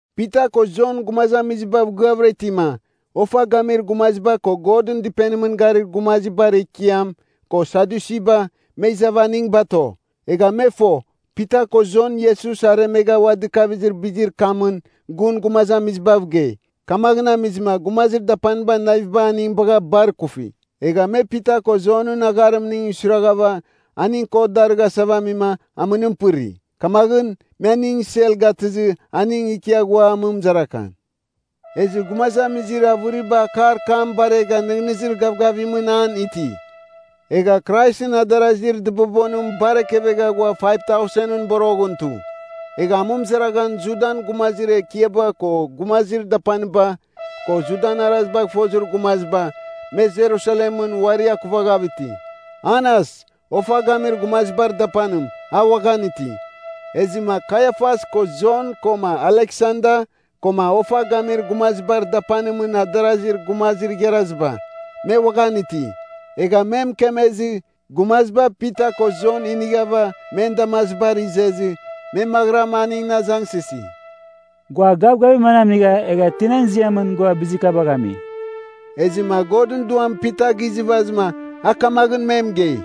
Pita ko Jon gumazamizibav gɨavɨra itima, ofa gamir gumaziba ko Godɨn Dɨpenimɨn garir gumazibar ekiam ko Sadyusiba, me izava aning bato. Egha me fo, Pita ko Jon Iesus aremegha ua dɨkavizir bizir kamɨn gun gumazamizibav gei. Kamaghɨn amizɨma gumazir dapanibar naviba aning bagha bar ikufi. Egha me Pita ko Jonɨn agharimning suiraghava aning kot darɨghasava amima, amɨnim pɨri. Kamaghɨn, me aning sel gatɨzɨ aning ikia ghua amɨmɨzaraghan. Ezɨ gumazamizir avɨriba akar kam baregha nɨghnɨzir gavgavimɨn an iti. Egha Kraisɨn adarazir dɨbobonim bar ekevegha ghua 5,000ɨn boroghɨn tu. Egha amɨmɨzaraghan Judan gumazir ekiaba ko gumazir dapaniba ko Judan arazibagh fozir gumaziba, me Jerusalemɨn uari akuvaghav iti. Anas, ofa gamir gumazibar dapanim, a uaghan iti, ezɨma Kaiafas ko Jon koma Aleksanda koma ofa gamir gumazibar dapanimɨn adarazir gumazir igharaziba, me uaghan iti. Egha me mɨkemezɨ, gumaziba Pita ko Jon inighava men damazibar izezɨ, me maghɨram aningɨn azangsɨsi, “Gua gavgavir manam inigha, egha tinan ziamɨn gua bizir kabagh ami?” Ezɨma Godɨn Duam Pita gizɨvazɨma, a kamaghɨn me mɨgei,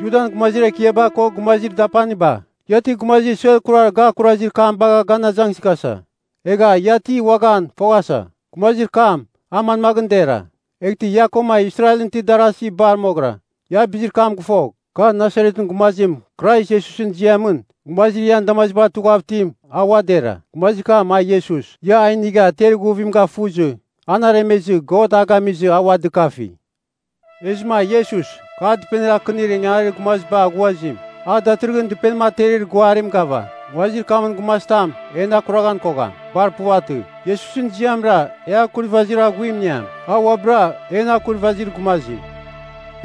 “Judan gumazir ekiaba ko gumazir dapaniba! Ia ti gumazir suer kurar ga akurazir kam bagha gan azangsɨghasa, egha ia ti uaghan foghasa, gumazir kam a manmaghɨn dera. Eghtɨ ia koma Israelɨn itir darasi bar moghɨra, ia bizir kam gɨfogh! Kar Nasaretɨn gumazim Krais Iesusɨn ziamɨn gumazir ian damazibar tughav itim a ua dera. Gumazir kam a Iesus, ia a inigha ter ighuvim gafuzɨ, an aremezɨ God a gamizɨ a ua dɨkafi. Ezɨma Iesus, ‘Kar dɨpenir akɨnir ingangarir gumaziba aghuazim, a datɨrɨghɨn dɨpenim aterir guarim gava.’ Nguazir kamɨn gumazitam en akuraghan kogham, bar puvatɨ. Iesusɨn ziamra e akurvazir aghuim iniam. A uabɨra, en akurvazir gumazim.”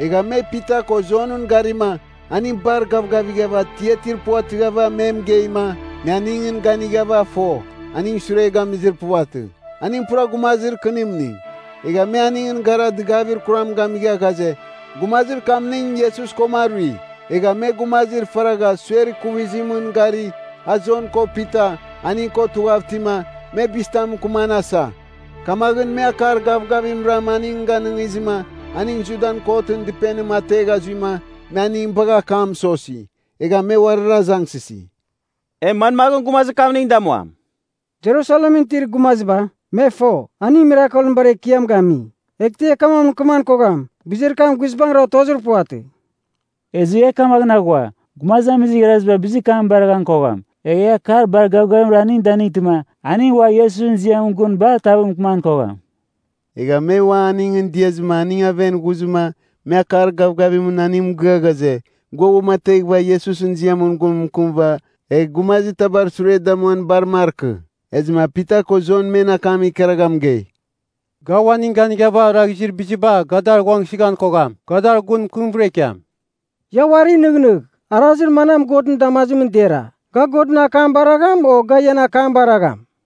Egha me Pita ko Jonɨn garima aning bar gavgavighav atiatir puvatɨghava me mɨgeima, me aningɨn ganighava fo, aning sure gamizir puvatɨ. Aning pura gumazir kɨnimning. Egha me aningɨn gara dɨgavir kuram gamigha ghaze, gumazir kamning Iesus koma arui. Egha me gumazir faragha suer ikuvizimɨn gari, a Jon ko Pita, aning ko tughav itima, me bizitam mɨkɨman asa. Kamaghɨn me akar gavgavimram aning ganɨngizɨma aning Judan kotɨn dɨpenim ategha zuima, me aning bagha akam mɨsosi. Egha me uarir azangsɨsi, “E manmaghɨn gumazir kamning damuam? Jerusalemɨn itir gumaziba, me fo, aning mirakelɨn bar ekiam gami. Eghtɨ e kamaghɨn mɨkɨman kogham, bizir kam guizbangɨra otozir puvatɨ. Ezɨ e kamaghɨn aghua, gumazamizir igharaziba bizir kam baraghan kogham. Egh e akar bar gavgavimra aning danightɨma aning ua Iesusɨn ziamɨn gun bar tav mɨkɨman kogham.” Egha me ua aningɨn diazɨma aning aven ghuzɨma me akar gavgavimɨn aningɨn mɨgɨa ghaze, gua uamateghɨva Iesusɨn ziamɨn gun mɨkɨmɨva egh gumazitabar sure damuan bar markɨ. Ezɨma Pita ko Jon men akam ikaragha mɨgei, “Ga uaning ganighava oraghizir biziba ga dar ghuangsɨghan kogham, ga dar gun mɨkɨmvɨra ikiam. Ia uari nɨghnɨgh, arazir manam Godɨn damazimɨn dera, ga Godɨn akam baragham, o ga ian akam baragham?”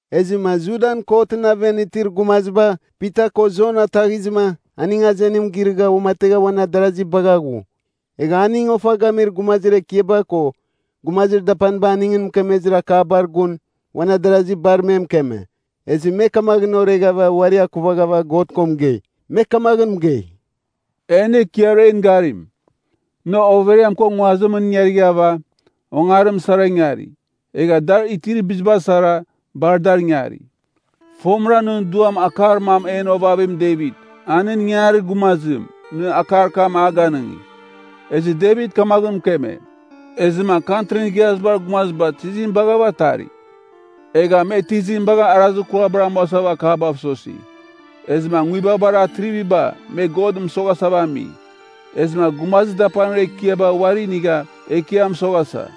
Ezɨma Judan kotɨn aven itir gumaziba Pita ko Jon ataghizɨma aning azenim girɨgha uamategha uan adarazi bagha ghu. Egha aning ofa gamir gumazir ekiaba ko gumazir dapaniba aningɨn mɨkemezir akabar gun uan adarasi bar me mɨkeme. Ezɨ me kamaghɨn oreghava uari akuvaghava God ko mɨgei. Me kamaghɨn mɨgei, “En Ekiar en garim, nɨ overiam ko nguazimɨn ingarighava, ongarim sara ingari, egha dar itir biziba sara, bar dar ingari. Fomɨra nɨn Duam akar mam en ovavim Devit, a nɨn ingangarir gumazim, nɨ akar kam a ganɨngi. Ezɨ Devit kamaghɨn mɨkeme, ‘Ezɨma Kantrin Igharazibar Gumaziba tizim baghava atari? Egha me tizim bagha arazir kurabar amuasava akabav sosi? Ezɨma nguibabar atriviba me God mɨsoghasava ami. Ezɨma gumazir dapanir ekiaba uari inigha Ekiam mɨsoghasa.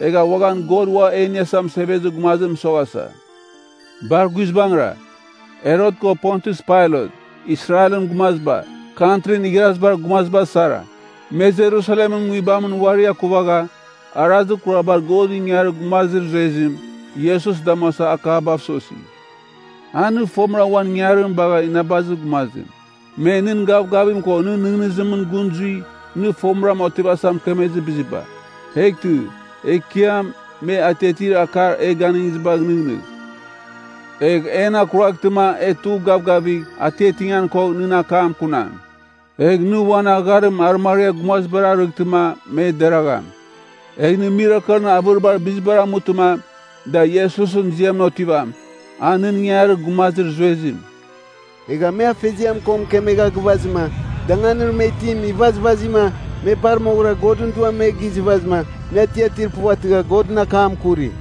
Egha uaghan God Uam E Iniasa Mɨsevezir Gumazim mɨsoghasa.’ “Bar guizbangɨra, Herot ko Pontius Pailat, Israelɨn gumaziba, Kantrin Igharazibar Gumaziba sara, me Jerusalemɨn nguibamɨn uari akuvaghava arazir kurabar Godɨn ingangarir gumazir zuezim, Iesus damuasava akabav sosi. A nɨ fomɨra uan ingangarim bagha inabazir gumazim. Me nɨn gavgavim ko nɨn nɨghnɨzimɨn gɨn zui, nɨ fomɨram otivasa mɨkemezir biziba. Eghtɨ, Ekiam, me atiatir akar e ganɨngizibagh nɨghnɨgh. Egh en akuraghtɨma e tugh gavgavigh atiatingan kogh nɨn akam kunam. Egh nɨ uan agharim arɨmariar gumazibar arɨghtɨma me deragham. Egh nɨ mirakelɨn avɨribar bizibar amutɨma da Iesusɨn ziamɨn otivam, a nɨn ingangarir gumazir zuezim.” Egha me Afeziam ko mɨkemegha gɨvazɨma, danganir me itim ivazvazima, me bar moghɨra Godɨn Duam me gizɨvazɨma, me atiatir puvatɨgha Godɨn akam kuri.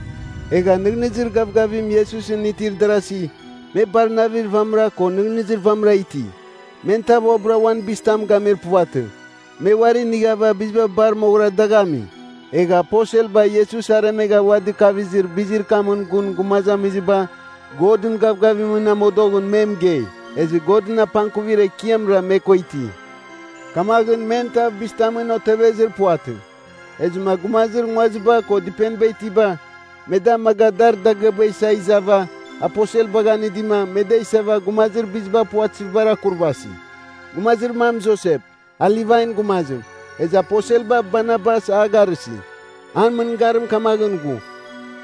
Egha nɨghnɨzir gavgavim Iesusɨn itir darasi, me bar navir vamɨra ko nɨghnɨzir vamɨra iti. Men tav uabɨra uan bizitam gamir puvatɨ, me uari inighava biziba bar moghɨra dagh ami. Egha aposelba Iesus aremegha ua dɨkavizir bizir kamɨn gun gumazamiziba, Godɨn gavgavimɨn amodoghɨn me mɨgei. Ezɨ Godɨn apangkuvir ekiamra me ko iti. Kamaghɨn men tav bizitamɨn otevezir puvatɨ. Ezɨma gumazir nguaziba ko dɨpeniba itiba, me da amaga dar dagɨaba isa izava, aposelbagh anɨdima, me da isava gumazir biziba puvatɨzibar akurvasi. Gumazir mam Josep, a Livan gumazim. Ezɨ aposelba Barnabas a garɨsi. An mɨngarim kamaghɨn ghu,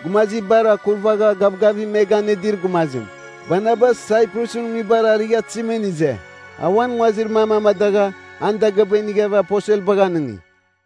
gumazibar akurvagha gavgavim me ganɨdir gumazim. Barnabas Saiprusɨn nguibar arighatɨzimɨn ize. A uan nguazir mam amadagha, an dagɨaba inighava aposelbagh anɨngi.